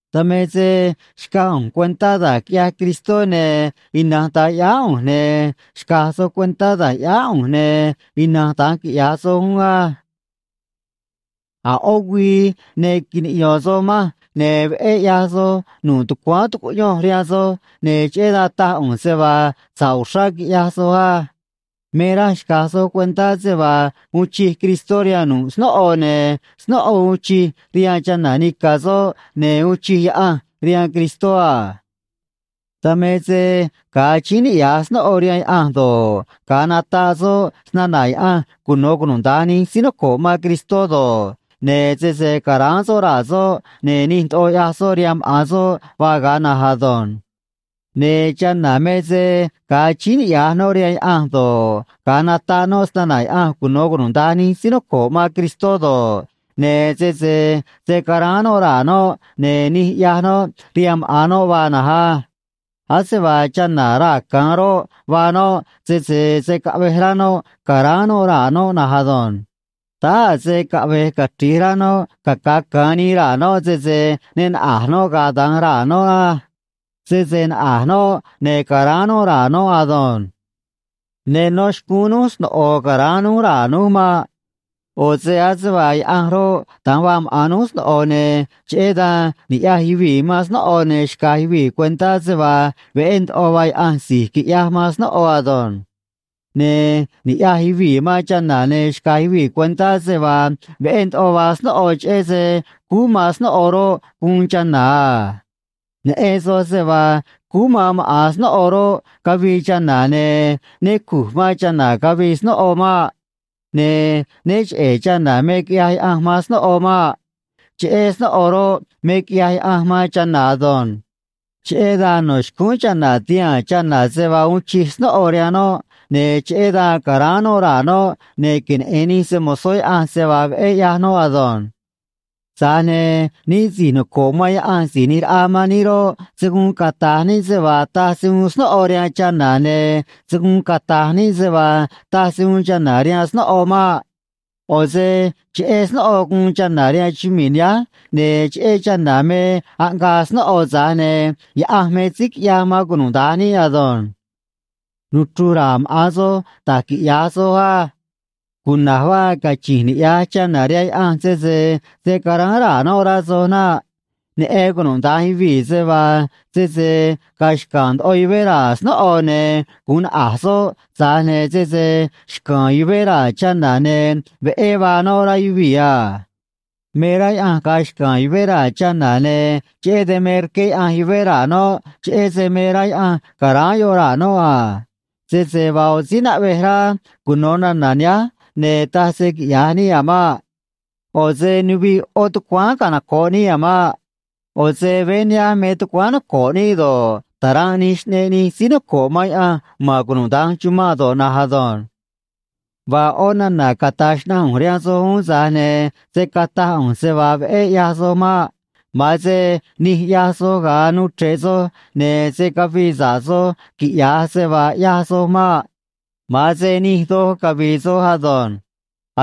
Dan me se xcaj ꞌu̱nj cuentá da̱j quiꞌyaj Cristó, ne̱ ina̱nj da̱nj ꞌyáá ꞌu̱nj, ne̱ xca̱j soj cuentá da̱j ꞌyáá ꞌu̱nj, ne̱ ina̱nj da̱nj quiꞌya̱j soj uún á. A̱ ꞌó güii ne quiniꞌyo̱n soj manj, ne̱ veꞌé ꞌyaj soj nu̱ꞌ tucuáán tucuꞌyonj rihaan soj, ne̱ cheꞌé dan taj ꞌu̱nj se vaa sa̱ꞌ uxrá quiꞌyaj soj á. Me raj xca̱j soj cuentá se vaa uun chij Cristó rihaan nu̱ꞌ snóꞌo, ne̱ snóꞌo uun chij rihaan chana̱ nica̱ soꞌ, ne̱ uun chij Yaꞌanj rihaan Cristó a. Dan me se ga̱a achíín niꞌya̱j snóꞌo rihaan Yaꞌanj do̱ꞌ, ga̱a nataꞌ soꞌ snana̱ Yaꞌanj cuno̱ cunuda̱nj nij síí noco̱ꞌ man Cristó do̱ꞌ, ne̱ sese ca̱ráán soꞌ raa̱ soꞌ, ne̱ nij ndoꞌo ꞌyaj soꞌ rihaan maꞌa̱n soꞌ vaa ga̱a na̱nj ado̱nj. Ne̱ chana̱ me se ga̱a achíín niꞌya̱j noꞌ rihaan Yaꞌanj do̱ꞌ, ga̱a nataꞌ noꞌ snana̱ Yaꞌanj cuno̱ cunuda̱nj nij síí noco̱ꞌ man Cristó do̱ꞌ, ne̱ sese se̱ caráán noꞌ raa̱ noꞌ, ne̱ nij ꞌyaj noꞌ rihaan maꞌa̱n noꞌ vaa na̱nj á. Ase vaa chana̱ raa̱ ca̱an roꞌ, vaa noꞌ, sese se̱ caꞌvej rá noꞌ ca̱ráán noꞌ raa̱ noꞌ na̱nj ado̱nj. Táá a̱ se caꞌve̱j cachri̱j rá noꞌ caca̱ ca̱an nii raa̱ noꞌ, sese ne naꞌa̱j noꞌ ga̱a̱ da̱nj raa̱ noꞌ á. Sese naꞌa̱j noꞌ, ne̱ ca̱ráán noꞌ raa̱ noꞌ ado̱nj. Ne nó xcúún núj sno̱ꞌo ca̱ráán núj raa̱ núj maꞌ. ꞌO̱ se ase vaa Yaꞌanj roꞌ, da̱nj vaa maꞌa̱n núj sno̱ꞌo, ne̱ cheꞌé dan niꞌya̱j yuvii̱ man snóꞌo ne̱ xcaj yuvii̱ cuentá se vaa veꞌé ndoꞌo vaa Yaꞌanj si̱j quiꞌyaj man snóꞌo ado̱nj. Ne̱ niꞌya̱j yuvii̱ man chana̱ ne̱ xcaj yuvii̱ cuentá se vaa veꞌé ndoꞌo vaa snóꞌo, cheꞌé se cúú man snóꞌo roꞌ, guun chana̱ a. Neꞌen soj se vaa cúú man maꞌa̱n snóꞌo roꞌ, cavii chana̱, ne̱ né cu̱j man chana̱ cavii snóꞌo maꞌ. Ne̱ né cheꞌe̱ chana̱ me quiꞌyaj Yaꞌanj man snóꞌo maꞌ. Cheꞌe̱ snóꞌo roꞌ, me quiꞌyaj Yaꞌanj man chana̱ ado̱nj. Cheꞌé dan no̱ xcúún chana̱ ti̱haa̱n chana̱ se vaa uun chij snóꞌo rihaan noꞌ, ne̱ cheꞌé dan ca̱ráán noꞌ raa̱ noꞌ, ne̱ queneꞌe̱n nij se‑mo̱zó Yaꞌanj se vaa veꞌé ꞌyaj noꞌ ado̱nj. Tza̱j ne̱ níꞌ si̱j noco̱ꞌ man Yaꞌanj Si̱j ꞌNi̱j Raꞌa man níꞌ roꞌ, se̱ guun cata̱j níꞌ se vaa taj se uun snóꞌo rihaan chana̱, ne̱ se̱ guun cata̱j níꞌ se vaa taj se uun chana̱ rihaan snóꞌo maꞌ. ꞌO̱ se cheꞌé snóꞌo guun chana̱ rihaan chumii̱ nihánj, ne̱ cheꞌé chana̱ me aꞌngaa snóꞌo, tza̱j ne̱ Yaꞌanj me síí quiꞌyaj man cunuda̱nj níꞌ ado̱nj. Nuchru̱j ra̱a̱ maꞌa̱n soj da̱j quiꞌya̱j soj á. Cuna̱j vaa cachi̱nj niꞌya̱j chana̱ rihaan Yaꞌanj sese se̱ caráán raa̱ noꞌ, rá soj naꞌ. Neꞌen cunuda̱nj yuvii̱ se vaa sese ga̱a̱ xca̱a̱n ndoꞌo yuvé raa̱ snóꞌo, ne̱ gu̱un naꞌa̱j soꞌ, tza̱j ne̱ sese xca̱a̱n yuvé raa̱ chana̱, ne̱ veꞌé vaa noꞌ, rá yuvii̱ a. Me rá Yaꞌanj ga̱a̱ xca̱a̱n yuvé raa̱ chana̱, ne̱ cheꞌé dan me rqué Yaꞌanj yuvé raa̱ noꞌ, cheꞌé se me rá Yaꞌanj ca̱ráán yoꞌ raa̱ noꞌ a. Sese vaa ꞌo̱ síí naꞌvej rá cuno̱ nana̱ nihánj, ne̱ taj se quiꞌya̱j níꞌ a̱ maꞌ. ꞌO̱ se nuviꞌ ꞌó tucuáán canoco̱ꞌ níꞌ a̱ maꞌ. ꞌO̱ se veé nihánj me tucuáán noco̱ꞌ níꞌ do̱ꞌ, ta̱ranꞌ nij xꞌneꞌ nij síí noco̱ꞌ man Yaꞌanj ma̱n cunuda̱nj chumanꞌ do̱ꞌ na̱nj ado̱nj. Vaa ꞌó nana̱ cata̱j xnaꞌanj ꞌu̱nj rihaan soj uún, tza̱j ne̱ se̱ cataj ꞌu̱nj se vaa veꞌé ꞌyaj soj maꞌ. Ma̱an se nij ꞌyaj soj ga̱a nuu chre̱ꞌ soj, ne̱ se̱ cavii sa̱ꞌ soj, quiꞌya̱j se vaa ꞌyaj soj maꞌ. Ma̱an se nij doj cavi̱i̱ soj ado̱nj.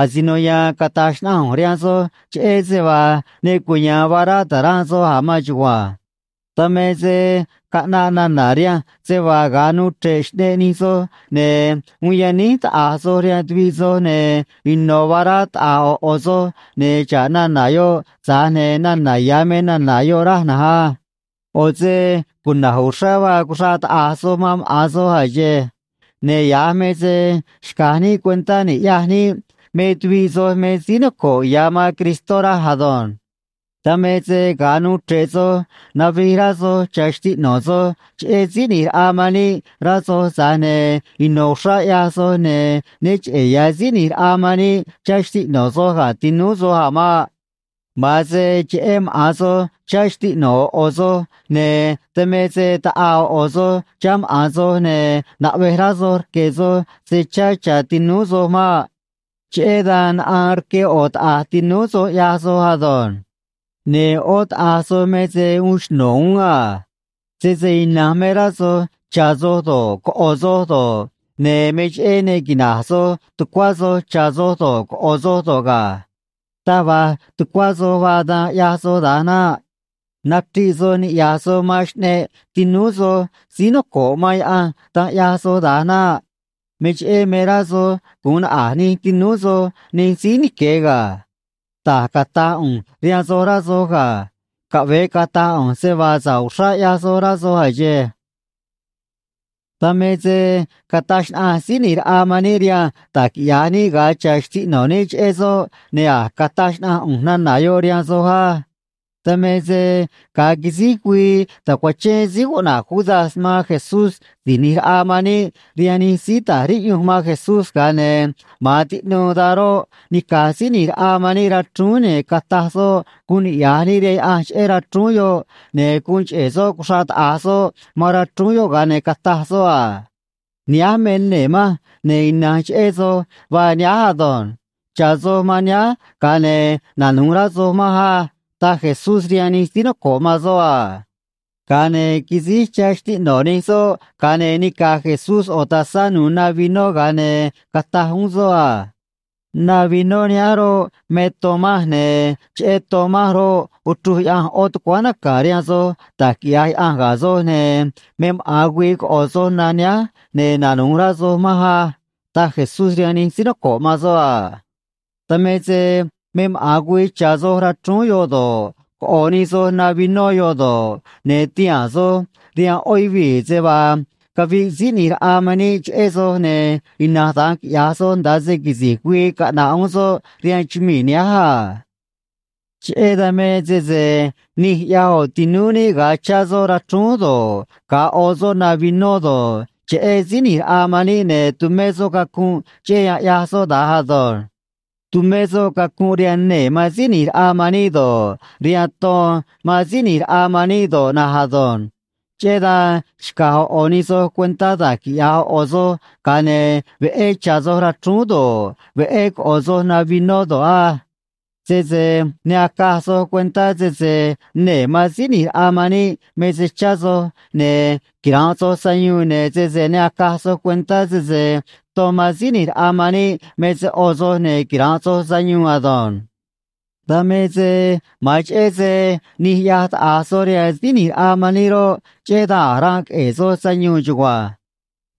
Asino ya̱a̱n cata̱j xnaꞌanj ꞌu̱nj rihaan soj cheꞌé se vaa ne cuya̱a̱n vaa rá ta̱ranꞌ soj a̱ maan chugua̱nj. Dan me se caꞌnaꞌ nana̱ rihanj se vaa ga̱a nuu chre̱ꞌ xꞌneꞌ nij soj, ne̱ uun yaníj taꞌa̱j soj rihaan tuviꞌ soj, ne̱ ino̱ vaa rá taꞌa̱j ꞌo̱ ꞌo̱ soj, ne̱ xa̱ꞌ nana̱ yoꞌ, tza̱j ne̱ nana̱ ya̱ me nana̱ yoꞌ, raj na̱nj á. ꞌO̱ se cuna̱j uxrá vaa cuxraꞌ taꞌa̱j soj man maꞌa̱n soj a̱ xe̱e̱. Ne̱ ya̱j me se xca̱j níꞌ cuentá ni̱ꞌyaj níꞌ me tuviꞌ soj me síí noco̱ꞌ ya̱ man Cristó raj ado̱nj. Dan me se ga̱a nuu chre̱ꞌ soj, navij rá soj chá xtiꞌno̱ soj cheꞌé Síí ꞌNi̱j Raꞌa man níꞌ, rá soj, tza̱j ne̱ ino̱ uxrá ꞌyaj soj, ne̱ né cheꞌe̱ ya̱ Síí ꞌNi̱j Raꞌa man níꞌ chá xtiꞌno̱ soj ga̱ tinúú soj a̱ maꞌ. Ma̱an se cheꞌé maꞌa̱n soj chá xtiꞌno̱ ꞌo̱ ꞌo̱ soj, ne̱ dan me se taꞌaa ꞌo̱ ꞌo̱ soj chá maꞌa̱n soj, ne̱ naꞌvej rá soj rque̱ soj se chá cha̱ tinúú soj maꞌ. Cheꞌé dan naꞌaan rque ꞌo̱ taꞌa̱j tinúú soj, ꞌyaj soj ado̱nj. Ne̱ ꞌó taꞌa̱j soj me se uun xno̱ uún a. Sese ina̱nj me rá soj cha̱ soj do̱ꞌ, coꞌo̱ soj do̱ꞌ, ne̱ me cheꞌé ne quina̱nꞌ soj tucuá soj cha̱ soj do̱ꞌ, coꞌo̱ soj do̱ꞌ ga̱. Taj va̱j tucuá soj vaa, dan ꞌyaj soj da̱nj naꞌ. Nachriꞌ soj niꞌya̱j soj man xꞌneꞌ tinúú soj síí noco̱ꞌ man Yaꞌanj, dan ꞌyaj soj da̱nj naꞌ. Me cheꞌé me rá soj gu̱un naꞌa̱j nij tinúú soj nij síí nique̱ ga̱. Da̱j cata̱j ꞌu̱nj rihaan soj, rá soj ga̱. Caꞌve̱e cata̱j ꞌu̱nj se vaa sa̱ꞌ uxrá ꞌyaj soj, rá soj a̱ xe̱e̱. Dan me se cataj xnaꞌanj Síí ꞌNi̱j Raꞌa man níꞌ rihanj da̱j quiꞌya̱j níꞌ ga̱a cha̱ xtiꞌno̱ níꞌ cheꞌé soꞌ, ne̱ a̱j cataj xnaꞌanj ꞌu̱nj nana̱ yoꞌ rihaan soj á. Dan me se ga̱a quisíj güii tacuachén síí cuꞌna̱j Judas man Jesús Si̱j ꞌNi̱j Raꞌa man níꞌ rihaan nij síí ta̱j riꞌyunj man Jesús, ga̱a ne̱ ma̱an tiꞌnuu dan roꞌ, nica̱j Síí ꞌNi̱j Raꞌa man níꞌ rachrúún, ne̱ cataj soꞌ guun niꞌya̱j níꞌ rihaan Yaꞌanj cheꞌé rachrúún yoꞌ, ne̱ guun cheꞌe̱ soꞌ cuxraꞌ taꞌa̱j soꞌ man rachrúún yoꞌ, ga̱a ne̱ cataj soꞌ a: “Nihánj me nee̱ manj, ne̱ ina̱nj cheꞌé soj vaa nihánj ado̱nj. Cha̱ soj man nihánj, ga̱a ne̱ nanu̱j rá soj manj á”, taj Jesús rihaan nij síí noco̱ꞌ man soꞌ a. Ga̱a ne̱ quisíj chá xtiꞌno̱ nij soꞌ, ga̱a ne̱ nica̱j Jesús ꞌo̱ tazá nu̱u̱ na vinó, ga̱a ne̱ cataj uún soꞌ a: “Na vinó nihánj roꞌ, me ton manj, ne̱ cheꞌé ton manj roꞌ, uchruj Yaꞌanj ꞌo̱ tucuáán naca̱ rihaan soj da̱j quiꞌya̱j Yaꞌanj ga̱ soj, ne̱ me maꞌa̱n güii coꞌo̱ soj na nihánj, ne̱ nanu̱j rá soj manj á”, taj Jesús rihaan nij síí noco̱ꞌ man soꞌ a. Dan me se me maꞌa̱n güii cha̱ soj rachrúún yoꞌ do̱ꞌ, coꞌo̱ nij soj na vinó yoꞌ do̱ꞌ, ne̱ ti̱haa̱n soj rihaan ꞌó yuvii̱ se vaa caviꞌ Síí ꞌNi̱j Raꞌa man níꞌ cheꞌé soj, ne̱ ina̱nj da̱nj quiꞌya̱j soj nda̱a se quisi̱j güii caꞌna̱ꞌ uún soꞌ rihaan chumii̱ nihánj a. Cheꞌé dan me sese nij ꞌyaj ꞌo̱ tinúú níꞌ ga̱a chá soꞌ rachrúún do̱ꞌ, ga̱a ꞌo soꞌ na vinó do̱ꞌ, cheꞌé Síí ꞌNi̱j Raꞌa man níꞌ, ne̱ tumé soꞌ cacunꞌ, cheꞌé yan ꞌyaj soꞌ da̱nj ado̱nj. Tumé soꞌ cacunꞌ rihaan nee̱ man Síí ꞌNi̱j Raꞌa man níꞌ do̱ꞌ, rihaan ton man Síí ꞌNi̱j Raꞌa man níꞌ do̱ꞌ na̱nj ado̱nj. Cheꞌé dan xca̱j ꞌo̱ ꞌo̱ nij soj cuentá da̱j quiꞌya̱j ꞌo̱ ꞌo̱ soj, ga̱a ne̱ veꞌé cha̱ soj rachrúún do̱ꞌ, veꞌé coꞌo̱ soj na vinó do̱ꞌ á. Sese ne acaj soj cuentá sese nee̱ man Síí ꞌNi̱j Raꞌa man níꞌ me se chá soj, ne̱ quira̱nꞌ soj sayuun, ne̱ sese ne acaj soj cuentá sese ton man Síí ꞌNi̱j Raꞌa man níꞌ me se ꞌo soj, ne̱ quira̱nꞌ soj sayuun ado̱nj. Dan me se ma̱an cheꞌé se nij ꞌyaj taꞌa̱j soj rihaan Síí ꞌNi̱j Raꞌa man níꞌ roꞌ, cheꞌé dan a̱j ranꞌ queꞌe̱e̱ soj sayuun chugua̱nj.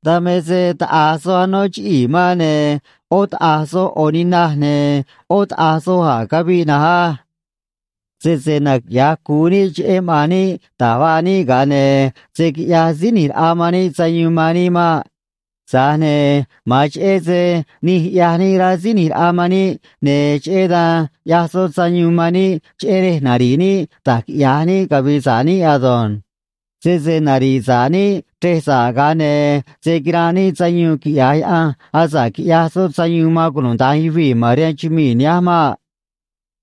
Dan me se taꞌa̱j soj anó chiꞌii̱ man, ne̱ ꞌó taꞌa̱j soj ꞌo̱ ninaj, ne̱ ꞌó taꞌa̱j soj a̱j caviꞌ na̱nj á. Sese naquiꞌya̱j cu̱u níꞌ cheꞌé maꞌa̱n níꞌ da̱j vaa níꞌ, ga̱a ne̱ se̱ quiꞌyaj Síí ꞌNi̱j Raꞌa man níꞌ sayuun man níꞌ maꞌ. Tza̱j ne̱ ma̱an cheꞌé se nij ꞌyaj níꞌ, rá Síí ꞌNi̱j Raꞌa man níꞌ, ne̱ cheꞌé dan ꞌyaj soꞌ sayuun man níꞌ, cheꞌé rej nari̱ꞌ níꞌ da̱j quiꞌya̱j níꞌ cavi̱i̱ sa̱ꞌ níꞌ ado̱nj. Sese nari̱ꞌ sa̱ꞌ níꞌ chrej sa̱ꞌ, ga̱a ne̱ se̱ quiranꞌ níꞌ sayuun quiꞌya̱j Yaꞌanj, asa̱ꞌ quiꞌyaj soꞌ sayuun man cunuda̱nj yuvii̱ ma̱n rihaan chumii̱ nihánj maꞌ.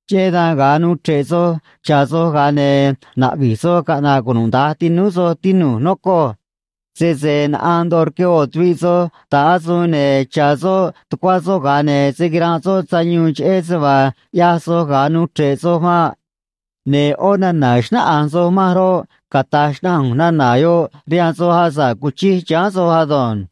Cheꞌé dan, ga̱a nuu chre̱ꞌ soj cha̱ soj, ga̱a ne̱ na̱ꞌvi̱j soj caꞌna̱ꞌ cunuda̱nj tinúú soj, tinu̱j, nocoj. Sese naꞌaan ndoꞌo rque ꞌo̱ tuviꞌ soj ta̱ꞌ asuun, ne̱ cha̱ soꞌ tucuá soꞌ, ga̱a ne̱ se̱ quiranꞌ soj sayuun cheꞌé se vaa ꞌyaj soj ga̱a nuu chre̱ꞌ soj maꞌ. Ne̱ ꞌó nana̱ xnáꞌanj soj manj roꞌ, cata̱j xnaꞌanj ꞌu̱nj nana̱ yoꞌ rihaan soj asa̱ꞌ cuchij chiháán soj ado̱nj.